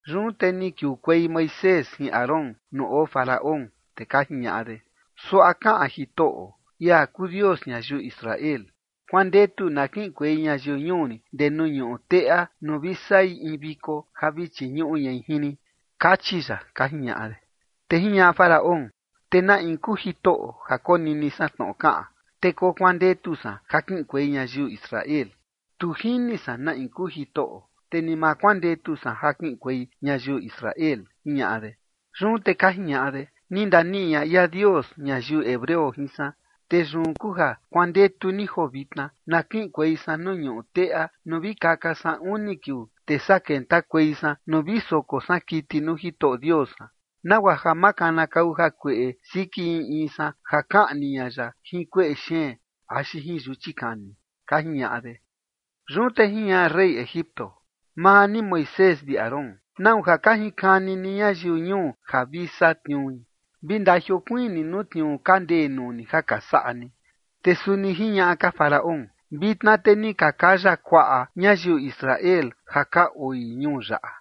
Yun te ni kiukuei Moisés jin Aarón nuu oo Faraón, te ka jiñaꞌa de: ―Suaꞌa kaꞌan Jitoꞌo, ia kuu Dios ñayiu Israel: “Kuandetu na kiꞌinkuei ñayiu ñuu rin ndee nuu ñuꞌu teꞌa nuu vi saꞌi in viko ja vi chiñuꞌu ñai jin rin, kachi ya” ―ka jiñaꞌa de. Te jiñaꞌa Faraón: ―¿Te na in kuu Jitoꞌo ja konini san tnoꞌo kaꞌan, te kokuandetu san ja kiꞌinkuei ñayiu Israel? Tu jini san na in kuu Jitoꞌo, te ni ma kuandetu san ja kiꞌinkuei ñayiu Israel ―jiñaꞌa de. Yun te ka jiñaꞌa de: ―Ni ndaniꞌi ña ia Dios ñayiu hebreo jin san, te yun kuu ja kuandetu ni joo vitna, na kiꞌinkuei san nuu ñuꞌu teꞌa nuu vi kaka san uni kiuu, te saa kentakuei san nuu vi soko san kiti nuu Jitoꞌo Dios san, nagua ja ma kanakau jakueꞌe siki in in san ja kaꞌni ña ya jin kueꞌe xeen axi jin yuchi kani ―ka jiñaꞌa de. Yun te jiñaꞌa rey Egipto: ―Maa ni Moisés vi Aarón, ¿nau ja ka jinkani ni ñayiu ñuu ni ja vi satniui? Vi ndajiokuiin ni nuu tniuu ka ndee nuu ni ja ka saꞌa ni. Te suni jiñaꞌa ka Faraón: ―Vitna te ni ka kaya kuaꞌa ñayiu Israel ja ka oi ñuu yaꞌa,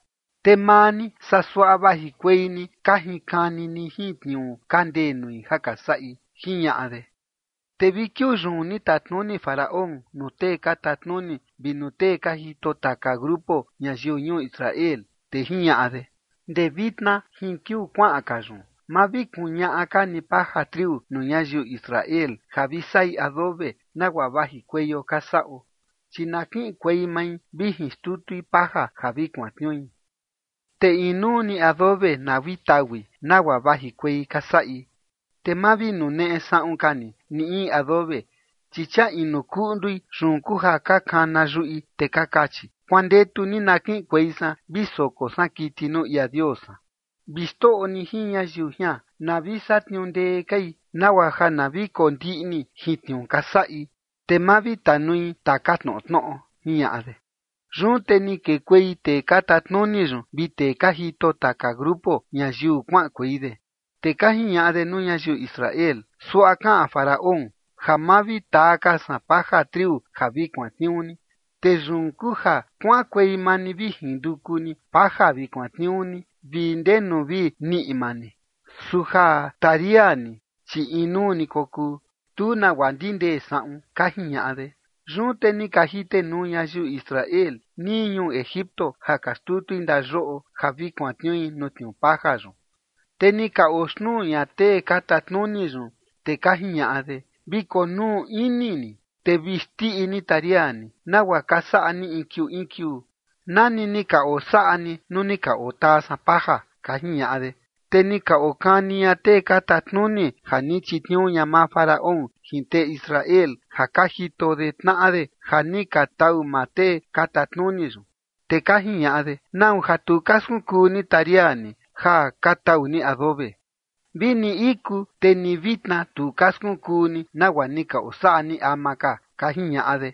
te maa ni saa suaꞌa vajikuei ni ka jinkani ni jin tniuu ka ndee nui ja ka saꞌi ―jiñaꞌa de. Te vi kiuu yun ni tatnuni Faraón nuu tee ka tatnuni vi nuu tee ka jito taka grupo ñayiu ñuu Israel, te jiñaꞌa de: ―Ndee vitna jin kiuu kuaꞌan ka yun ma vi kuñaꞌa ka ni paja triu nuu ñayiu Israel ja vi saꞌi adobe nagua vajikueio ka saꞌo, chi na kiꞌinkuei mai vi jinxtutui paja ja vi kuantniui. Te inuu ni adobe na vi taui nagua vajikuei ka saꞌi, te ma vi nuneꞌe saꞌun ka ni ni in adobe, chi chia inu kuꞌndui, yun kuu ja ka kana yuꞌi, te ka kachi: “Kuandetu ni na kiꞌinkuei san vi soko san kiti nuu ia Dios san”. Vi xtoꞌo ni jin ñayiu jian na vi satniuu ndee kai nagua ja na vi kondiꞌni jin tniuu ka saꞌi, te ma vi tanui taka tnoꞌo tnoꞌo ―jiñaꞌa de. Yun te ni kekuei tee ka tatnuni yun vi tee ka jito taka grupo ñayiu kuaꞌankuei de, te ka jiñaꞌa de nuu ñayiu Israel: ―Suaꞌa kaꞌan Faraón: “Ja ma vi taa ka san paja triu ja vi kuantniuu ni. Te yun kuu ja kuaꞌankuei maa ni vi jinduku ni paja vi kuantniuu ni ndenu vi niꞌi maa ni, su ja taria ni, chi inuu ni kokuu, tu nagua ndindee saꞌun” ―ka jiñaꞌa de. Yun te ni ka jitenuu ñayiu Israel nii ñuu Egipto ja ka xtutui ndayoꞌo ja vi kuantniui nuu tniuu paja yun. Te ni ka oxtnuu ña tee ka tatnuni yun, te ka jiñaꞌa de: ―Vi konuu ini ni te vi xndiꞌi ni taria ni, nagua ka saꞌa ni in kiuu in kiuu, nani ni ka osaꞌa ni nuu ni ka otaa san paja ―ka jiñaꞌa de. Te ni ka okani ña tee ka tatnuni ja ni chitniuu ña maa Faraón jin tee Israel ja ka jito de tnaꞌa de ja ni ka tau maa tee ka tatnuni yun, te ka jiñaꞌa de: ―¿Nau ja tu ka skunkuu ni taria ni ja ka tau ni adobe? Vini iku te ni vitna tu ka skunkuu ni nagua ni ka osaꞌa ni ama ka ―ka jiñaꞌa de.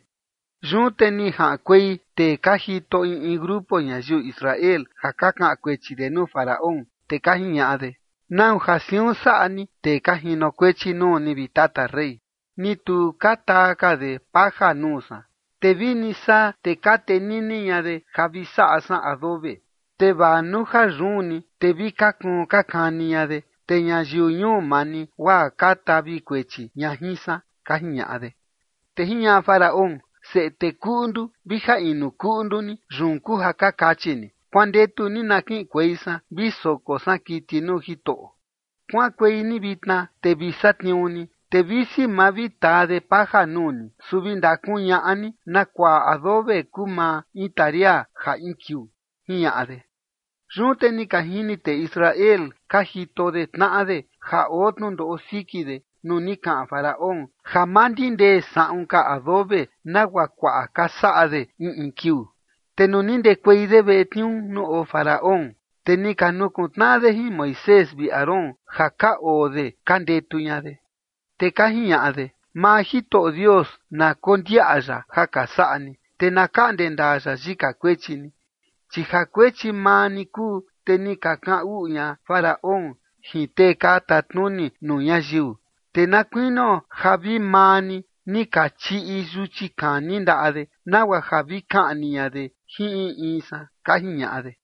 Yun te ni jaꞌankuei tee ka jito in in grupo ñayiu Israel ja ka kaꞌan kuechi de nuu Faraón, te ka jiñaꞌa de: ―¿Nau ja siun saꞌa ni tee ka jinokuechi nuu ni, vi tata rey? Ni tu ka taa ka de paja nuu san, te vini saa te ka tenini ña de ja vi saꞌa san adobe, te vaa nuu ja yun ni, te vi ka kuun ka kani ña de, te ñayiu ñuu maa ni guaa ka tavi kuechi ña jin san ―ka jiñaꞌa de. Te jiñaꞌa Faraón: ―Seꞌe tee kuꞌndu vi ja inu kuꞌndu ni, yun kuu ja ka kachi ni: “Kuandetu ni na kiꞌinkuei san vi soko san kiti nuu Jitoꞌo”. Kuaꞌankuei ni vitna, te vi satniuu ni, te visi ma vi taa de paja nuu ni, su vi ndakuñaꞌa ni na kuaꞌa adobe kuu maa in taria ja in kiuu ―jiñaꞌa de. Yun te ni ka jini tee Israel ka jito de tnaꞌa de ja oo tnundoꞌo siki de nuu ni kaꞌan Faraón ja ma ndindee saꞌun ka adobe nagua kuaꞌa ka saꞌa de in in kiuu. Te nuu ni ndekuei de veꞌe tniuu nuu oo Faraón, te ni ka nukuntnaꞌa de jin Moisés vi Aarón ja ka oo de ka ndetu ña de. Te ka jiñaꞌa de: ―Maa Jitoꞌo Dios na kondiaꞌa ya ja ka saꞌa ni, te na kaꞌnde ndaa ya yika kuechi ni. Chi ja kuechi maa ni kuu, te ni ka kaꞌan uꞌu ña Faraón jin tee ka tatnuni nuu ñayiu, te na kuinio ja vi maa ni, ni ka chiꞌi yuchi kani ndaꞌa de, nagua ja vi kaꞌni ña de jin in in san ―ka jiñaꞌa de.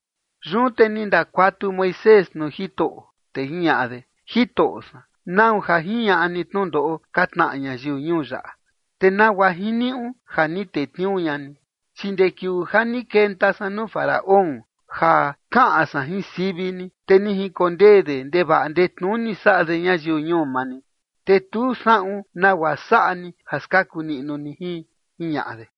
Yun te ni ndakuatu Moisés nuu Jitoꞌo, te jiñaꞌa de: ―Jitoꞌo san, ¿nau ja jiñaꞌa ni tnundoꞌo ka tnaꞌa ñayiu ñuu yaꞌa? ¿Te nagua jiniuꞌu ja ni tetniuu ña ni? Chi ndee kiuu ja ni kenta san nuu Faraón ja kaꞌan san jin sivi ni, te ni jinkondee de ndevaꞌa ndetnuni saꞌa de ñayiu ñuu maa ni, te tu saꞌun nagua saꞌa ni ja skaku niꞌnu ni jin ―jiñaꞌa de.